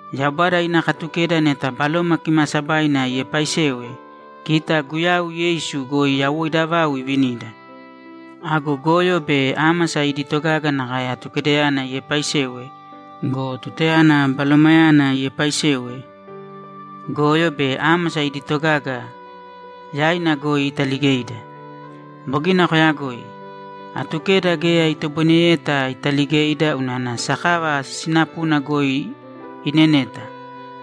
Yaubada ina Katukeda neta Baloma Kimaasabaina iepaaisewe, kita Guyau Yeisu goi yawoida vau ivinida. Ago goyo be ámasa idi togaga nakae Atukedayana iepaaisewe go, tutayana Balomayana iepaaisewe, goyo be ámasa idi togaga yaina goi italigeida. Bogina koyagoi. Atukeda geya itoboineyeta italigeida unana sakava sinapuna goi ineneta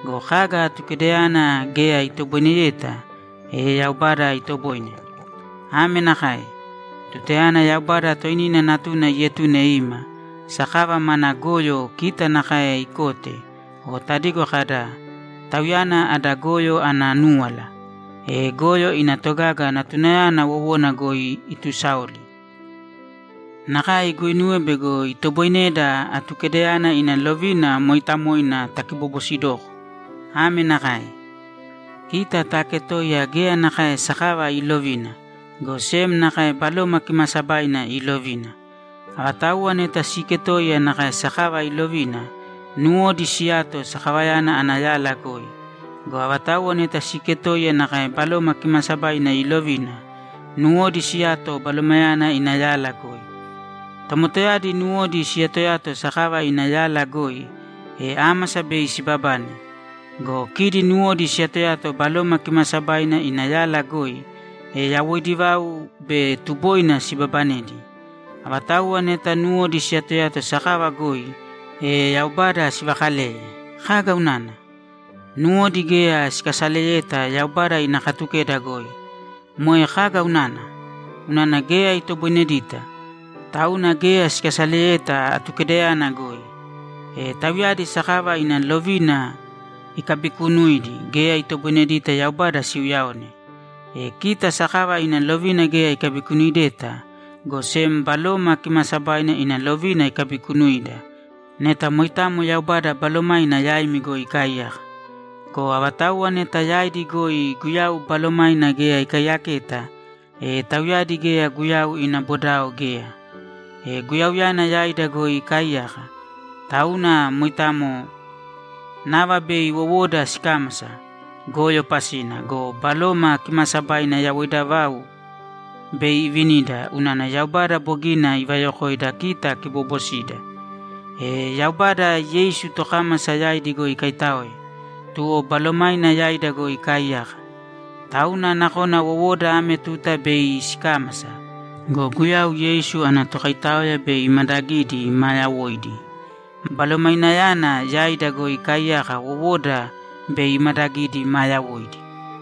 go, kaga Atukedayana geya itoboineyeta, e Yaubada itoboine. Ame nakae: Tutayana Yaubada toinina Natuna ietune ima, sakava mana goyo kita nakae ikote o tadigo kada, ‘Tauyana ada goyo ana núwala’, e goyo ina togaga Natunayana wowona goi itusaoli. Nakae iguinuwe bego itoboineda Atukedayana ina lovina mooitamoina takibobosidoko ame nakae: Kita taaketoiya geya nakae sakava iilovina, go sem nakae Baloma Kimaasabaina iilovina. Avatauwa neta siiketoiya nakae sakava iilovina, nuwodi siyato sakavayana ana yala goi. Go avatauwa neta siiketoiya nakae Baloma Kimaasabaina iilovina, nuwodi siyato Balomayana ina yala goi. Tomotayadi nuwodi siyatoyato sakava ina yala goi, e ámasa bei sibabane. Go kidi nuwodi siyatoyato Baloma Kimaasabaina ina yala goi, e yawoidi vau be tuboina sibabanedi. Avatauwa neta nuwodi siyatoyato sakava goi, e Yaubada sivakaleye. Kaga unana? Nuwodi geya sikasaleyeta Yaubada ina Katukeda goi. Moe kaga unana? Unana geya itoboinedita! Tauna geya sikasaleyeta Atukedayana goi. E tauyadi sakava ina lovina ikabikuunuidi geya itoboinedita Yaubada siuyaone. E kita sakava ina lovina geya ikabikunuideta, go sem Baloma Kimaasabaina ina lovina ikabikunuida neta moitamo Yaubada Balomaina yaimi goi ikaaiyaka. Go avatauwa neta yaidi goi Guyau Balomaina geya ikaiyaketa, e tauyadi geya Guyau ina bodao geya. E Guyauyana yaida goi ikaaiyaka, tauna moitamo nava bei wowoda sikámasa goyo pasina go, Baloma Kimaasabaina yawoida vau bei ivinida unana Yaubada bogina ivayokoida kita kiboobosida. E Yaubada Yeisu tokámasa yaidi goi ikaitáoe, tuwo Balomaina yaida goi ikaaiyaka. Tauna nakona wowoda ame tuta bei sikámasa go, Guyau Yeisu ana Tokaitaoya bei imadagidi maa yawoidi. Balomainayana yaida goi ikaaiyaka wowoda bei imadagidi maa yawoidi.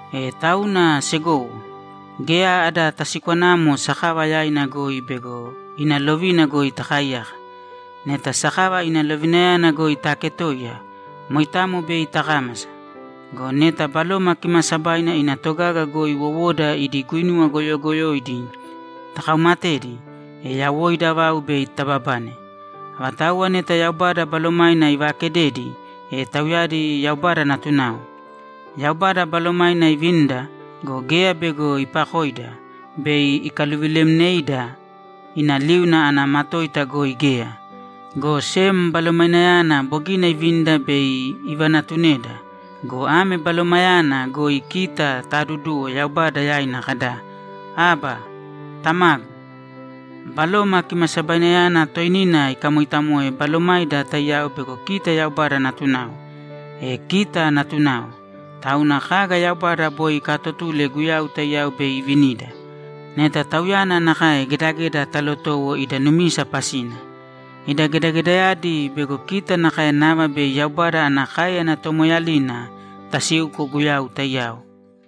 E tauna, segowo, geya ada tasikwanamo sakava yaina goi bego ina lovina goi takaaiyaka. Neta sakava ina lovinayana goi taaketoiya, moitamo bei takámasa. Go neta Baloma Kimaasabaina ina togaga goi wowoda idi guinuwa goyogoyoidi takaumatedi, e yawoida vau bei tababane. Avatauwa neta Yaubada Balomaina ivaakededi, e tauyadi Yaubada natunao. Yaubada Balomaina ivinida go, geya bego ipakoida bei ikaluvilemneida ina liuna ana matoita goi geya. Go sem Balomainayana bogina ivinida bei ivanatuneda go, ame Balomayana goi kita taaduduwo Yaubada yaina kada, ‘Abba, Tamagu!’ Baloma Kimasabainayana toinina ikamoitamoe balomaida taiyao bego kita Yaubada natunao. E kita natunao, tauna kaga Yaubada boi ikaatotule Guyau taiyao bei ivinida, neta Tauyana nakae gedageda talotowo ida numisa pasina. Ida gedagedayadi bego kita nakae nava bei Yaubada ana káeyana tomoeeyalina tasiuko Guyau taiyao.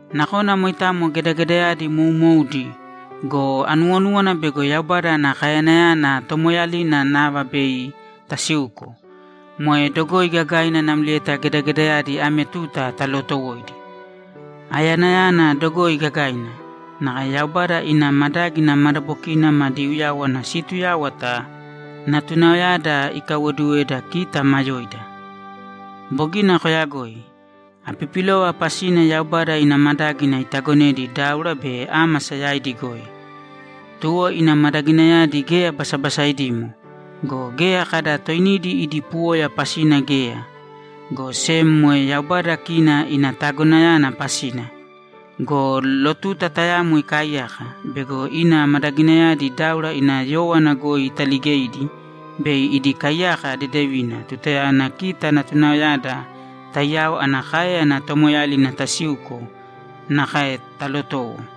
Nakona moitamo gedagedayadi moumoudi go, anuwonúwana bego Yaubada ana kaeyanayana tomoeeyalina nava bei tasiuko, moe dogoi gagaina namlieta gedagedayadi ame tuta talootowoidi. Aeyanayana dogoi gagaina, nakae Yaubada ina madágina madabokina madi uyáwana siituyáwata natunaoyada ikaiwoduweda kita maa yoida. Bogina koyagoi. Apipilova pasina Yaubada ina madágina itagonedi dáura be ámasa yaidi goi. Tuwo ina madaginayadi geya basabasaidimo go, geya kada toinidi idi puwoya pasina geya, go sem moe Yaubada kina ina tagonayana pasina. Go lotuta tayamo ikaaiyaka bego ina madaginayadi dáura ina yówana goi italigeidi bei idi kaiyaka dedevina tutayana kita natunaoyada taiyao ana káeyana tomoeeyalina tasiuko nakae talotowo.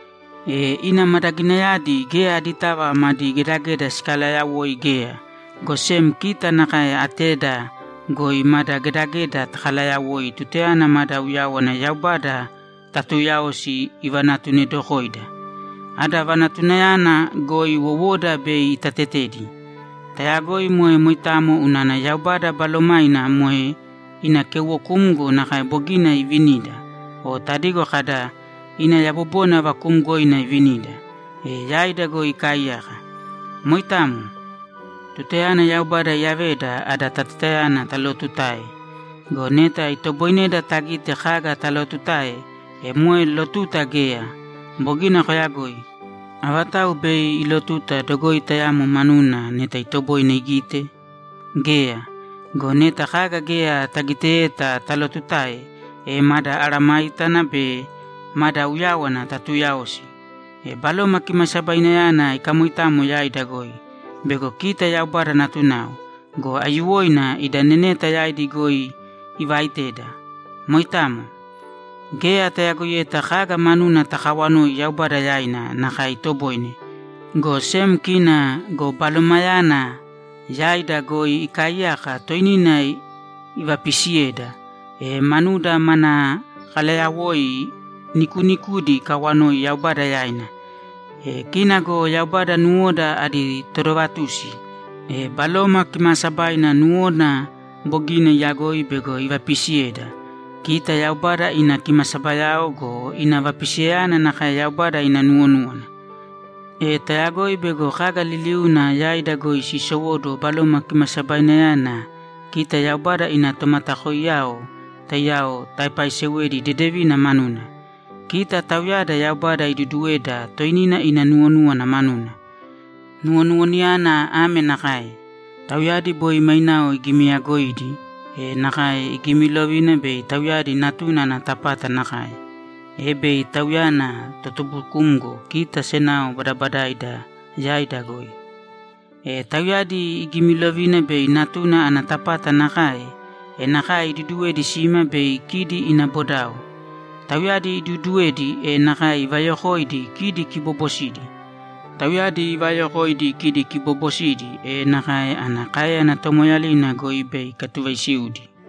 E ina madaginayadi geya aditava madi gedageda sikalaayawoi geya, go sem kita nakae ateda goi mada gedageda takalaayawoi tutayana mada uyáwana Yaubada tatuuyaosi ivanatunedokoida. Ada vanatunayana goi wowoda bei itatetedi. Tayagoi moe moitamo unana Yaubada Balomaina moe ina keuwokumgo nakae bogina iivinida o tadigo kada, ‘Ina yabobona vakuumgoina ivinida’, e yaida goi ikaaiyaka. Moitamo. Tutayana Yaubada iyaveda ada tatetayana talootutae. Go neta itoboineda tagite kaga talotutae, e moe lotuta geya. Bogina koyagoi. Avatau bei ilotuta dogoi tayamo manuna neta itoboine igite? Geya! Go neta kaga geya tagiteyeta talotutae, e mada mesayágana be mada uyáwana tatuuyaosi. E Baloma Kimasabainayana ikamoitamo yaida goi bego kita Yaubada natunao go, aiyuwoina ida neneta yaidi goi ivaiteda. Moitamo. Geya tayagoiyeta kaga manuna takawanoi Yaubada yaina nakae itoboine, go sem kina go Balomayana yaida goi ikaaiyaka toinina ivapisiyeda, e manuda mana kalayawoi nikuunikudi ikawanoi Yaubada yaina. E kina go Yaubada nuwoda adi todovatusi, e Baloma Kimaasabaina nuwona bogina iyagoi bego ivapisiyeda, kita Yaubada ina kimasabayao go, ina vapisiyayana nakae Yaubada ina nuwonúwana. E tayagoi bego kaga liliuuna yaida goi siisowóduwo Baloma Kimasabainayana kita Yaubada ina tomatakoiyao taiyao taepaisewedi dedevina manuna, kita tauyada Yaubada iduduweda toinina ina nuwonúwana manuna. Nuwonuwanayana ame nakae: Tauyadi boi mainao igimiyagoidi, e nakae igimilovina bei tauyadi Natuna ana tapata nakae, e bei Tauyana totubukumgo kita senao badabadaida yaida goi. E tauyadi igimilovina bei Natuna ana tapata nakae, e nakae iduduwedi sima bei kidi ina bodao. Tauyadi iduuduwedi, e nakae ivayokoidi kidi kiboobosidi. Tauyadi ivaayokoidi kidi kiboobosidi, e nakae ana káeyana tomoeeyalina goi bei ikatuvaisiudi.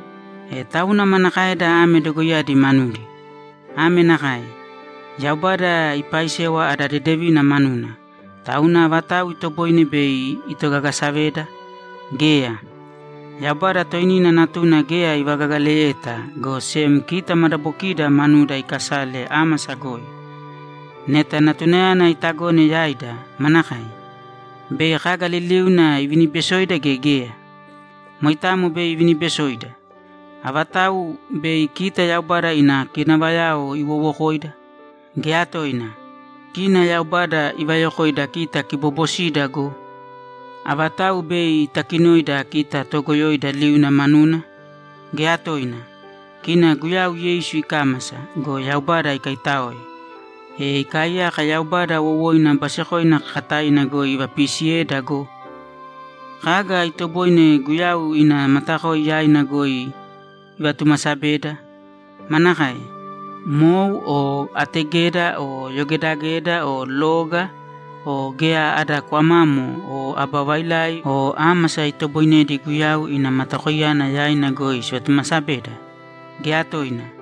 E tauna manakaeda ame dogoiyadi manudi? Ame nakae: Yaubada ipaaisewa ada dedevina manuna, tauna avatau itoboine bei itogagasaveda? Geya! Yaubada toinina Natuna geya ivagagaleyeta, go sem kita madabokiida manuda ikasale ámasa goi. Neta Natunayana itagone yaida, manakae? Bei kaga liliuna ivinibesoida gea geya? Moitamo bei ivinibesoida! Avatau bei kita Yaubada ina kinavayao iwowokoida? Geya toina! Kina Yaubada ivayokoida kita kiboobosida go! Avatau bei itakinoida kita toogoyoida liuna manuna? Geya toina! Kina Guyau Yeisu ikámasa go, Yaubada ikaitáoe, e ikaaiyaka Yaubada wowoina basekoina kakataina goi ivapiisiyeda go! Kaga itoboine Guyau ina matakoi yaina goi ivatumasabeda? Manakae? Mou o ategeda o yogedageda o loga o geya ada kwamamo o aba vailai o ámasa itoboinedi Guyau ina matakoiyana yaina goi sivatumasabeda? Geya toina!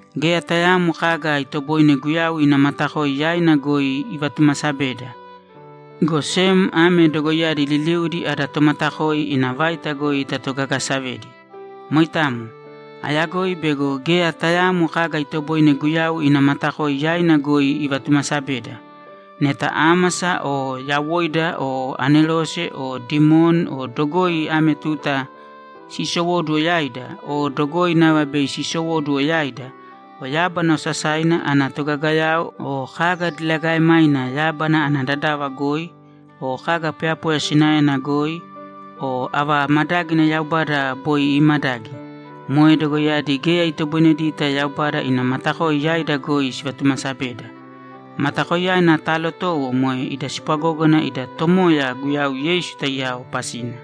Geya tayaamo kaga itoboine Guyau ina matakoi yaina goi ivatumasabeda, go sem ame dogoiyadi liliudi ada Tomatakoi ina vaita goi tatogagasavedi. Moitamo. Ayagoi bego geya tayaamo kaga itoboine Guyau ina matakoi yaina goi ivatumasabeda. Neta ámasa o yawoida o anerose o dimoni o dogoi ame tuta siisowóduwo yaida o dogoi nava bei sisowóduwo yaida o yábana osasaina ana totogagayao o kaga diligaemaina yábana ana dadava goi o kaga poyapoya sinaena goi o ava madágina Yaubada boi iimadagi. Moe dogoiyadi geya itoboinedita Yaubada ina matakoi yaida goi sivatumasabeda. Matakoiyana taalotowo moe ida spwagógana ida Tomoya Guyau Yeisu taiyao pasina.